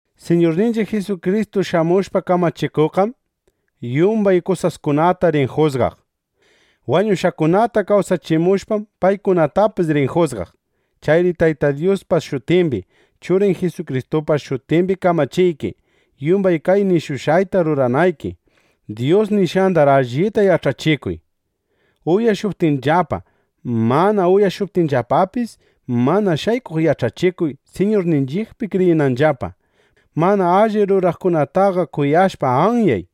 Siñurninchiq Jisukristu shamushpa kamachikuqqam, yumbay kawsaqkunata rin jusgaq. Wañushqakunata kawsachimushpam, paykunatapis rin jusgaq. Chayri Tayta Dyuspa shutimbi, Churin Jisukristupa shutimbi kamachiyki, yumbay kay nishushqayta ruranayki. Dyus nishqandar allita yach'achikuy. Uyashuptinllapa, mana uyashuptinllapapis, mana shaykuq yach'achikuy, Siñurninchiqpi kriyinanllapa. Mana alli ruraqkunataqa kuyashpa anyay.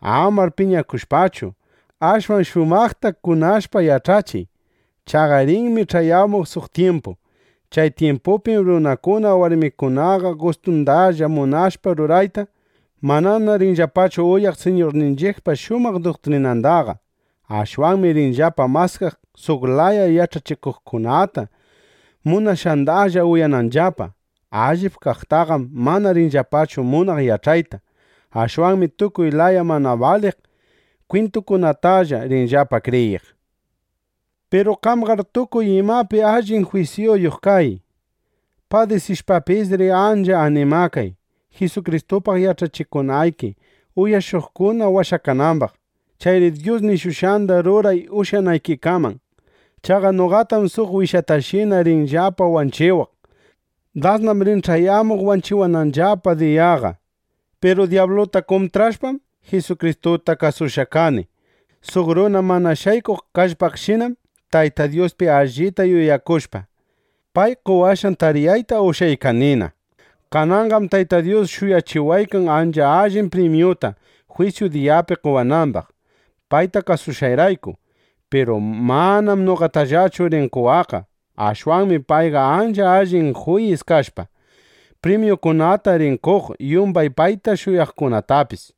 Amar piñakushpachu, ashwan shumaqta kunashpa yach'achiy. Chaqa rinmi ch'ayamuq suq tyimpu. Chay tyimpupim runakuna warmikunaqa gustundalla munashpa rurayta, manana rinllapachu uyaq Siñurninchiqpa shumaq duktrinandaqa. Ashwanmi rinllapa maskaq suq laya yach'achikuqkunata, munashqandalla uyananllapa. Allip kaqtaqam mana rinllapachu munaq yach'ayta. Ashwanmi tukuy laya mana baliq kwintukunatalla rinllapa kriyiq. Piru qamqar tukuy imapi allin jwisyuyuq kay. Padisishpapisri ancha animakay, Jisukristupaq yach'achikunayki, uyashuqkuna washakanambaq. Chayri Dyus nishushqanda ruray ushyanaykikaman. Chaqa noqatam suq wishatashina rinllapana wanchiwaq. Dasnam rin ch'ayamuq wanchiwananllapa diyaqa. Piru dyabluta kuntrashpam, Jisukristuta kasushqa kani. Suq runa mana shaykuq kallpaqshinam Tayta Dyuspi allita yuyakushpa, pay qowashqan tariyayta ushyaykanina. Kananqam Tayta Dyus shuyachiwaykan ancha allin primyuta, jwisyu diyapi qowanambaq, payta kasushqayrayku. Piru manam noqatallachu rin qowaqqa. Ashwanmi payqa ancha allin juyis kashpa, primyukunata rin qoq yumbay payta shuyaqkunatapis.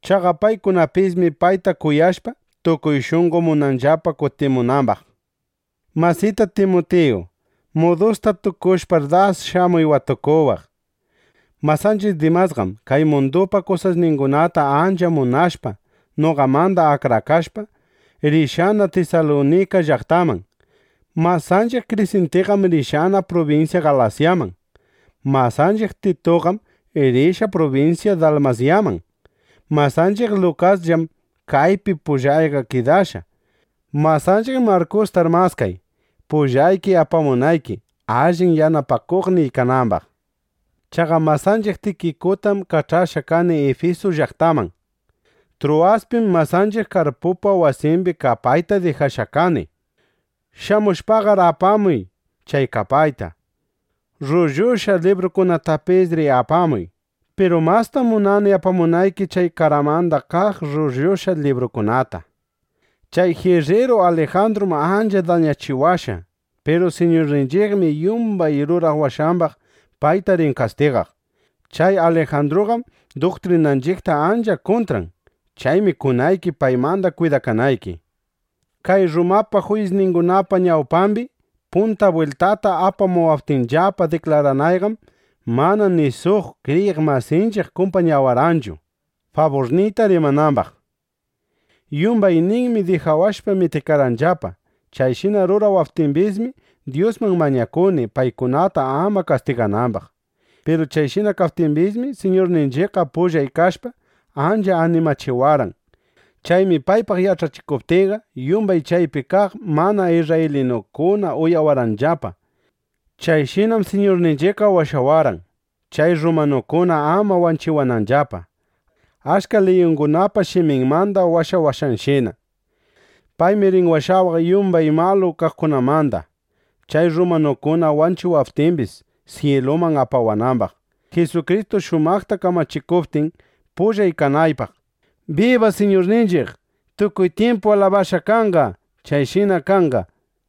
Chaqa paykunapismi payta kuyashpa, tukuy shunqo munanllapa kutimunambaq. Masita Timutiyu, mudusta tukushpar, das shamuy watukuwaq. Masanchiq Dimasqam kay mundupa kusasningunata ancha munashpa, noqamanda akrakashpa, rishqana Tisalunika llaqtaman. Masanchiq Krisintiqam rishqa prubinsya Galasyaman. Masanchiq Tituqam rishqa prubinsya Dalmasyaman. Masanchiq Lukasllam kaypi pullayqa kidashqa. Masanchiq Markustar maskay, pullayki apamunayki, allin yanapakuqniy kanambaq. Chaqa masanchiq Tikikutam kach'ashqa kani Ifisu llaqtaman. Truwaspim masanchiq Karpupa wasimbi kapayta dijashqa kani. Shamushpaqar apamuy chay kapayta. Rrullushqa libruykunatapisri apamuy. Piru mastam munani apamunayki chay qaramanda kaq rrullushqa libruykunata. Chay jirriru Alijandrum ancha dañachiwashqa. Piru Siñurninchiqmi yumbay rurawashqambaq payta rin kastigaq. Chay Alijandruqam duktrinanchiqta ancha kuntran. Chaymi kunayki, paymanda kwidakanayki. Kay Rrumapa juyisningunapa ñawpambi punta bwiltata apawaptinllapa diklaranayqam, mana ni suq (kriyiq masinchiq) kumpañawarqanchu, faburniyta rimanambaq. Yumbayninmi dijawashpa mitikarqanllapa. Chayshina rurawaptimbismi, Dyusman mañakuni, paykunata ama kastiganambaq. Piru chayshina kaptimbismi, Siñurninchiqqa pullay kashpa, ancha animachiwarqan. Chaymi paypaq yach'achikuptiyqa, yumbay chaypi kaq mana isrraylinukuna uyawarqanllapa. Chayshinam Siñurninchiqqa washawarqan, chay rrumanukuna ama wanchiwananllapa, achka liyungunapa shiminmanda washawashqanshina. Paymi rin washawaq yumbay malu kaqkunamanda, (chay rrumanukuna wanchiwaptimbis) syiluman apawanambaq, Jisukristu shumaqta kamachikuptin, pullan kanaypaq. ¡Biba Siñurninchiq! ¡Tukuy tyimpu alabashqa kanqa! Chayshina kanqa.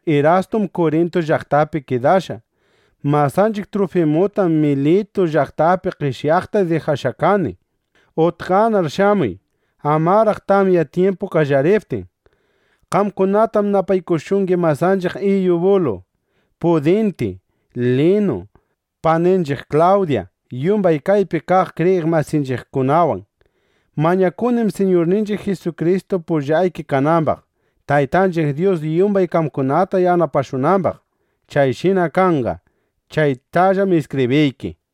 Masanchiq Irastum Kurintu llaqtapi kidashqa. Masanchiq Trufimutam Militu llaqtapi qeshyaqta dijashqa kani. Utqanar shamuy, amaraq tamya tyimpu qallariptin. Qamkunatam napaykushungi masanchiq Iyubulu, Pudinti, Linu, paninchiq Klawdya, yumbay kaypi kaq kriyiq masinchiqkunawan. Mañakunim, Siñurninchiq Jisukristu pullayki kanambaq, Taytanchiq Dyus yumbay qamkunata yanapashunambaq. Chayshina kanqa. (Chaytallam iskibriyki.)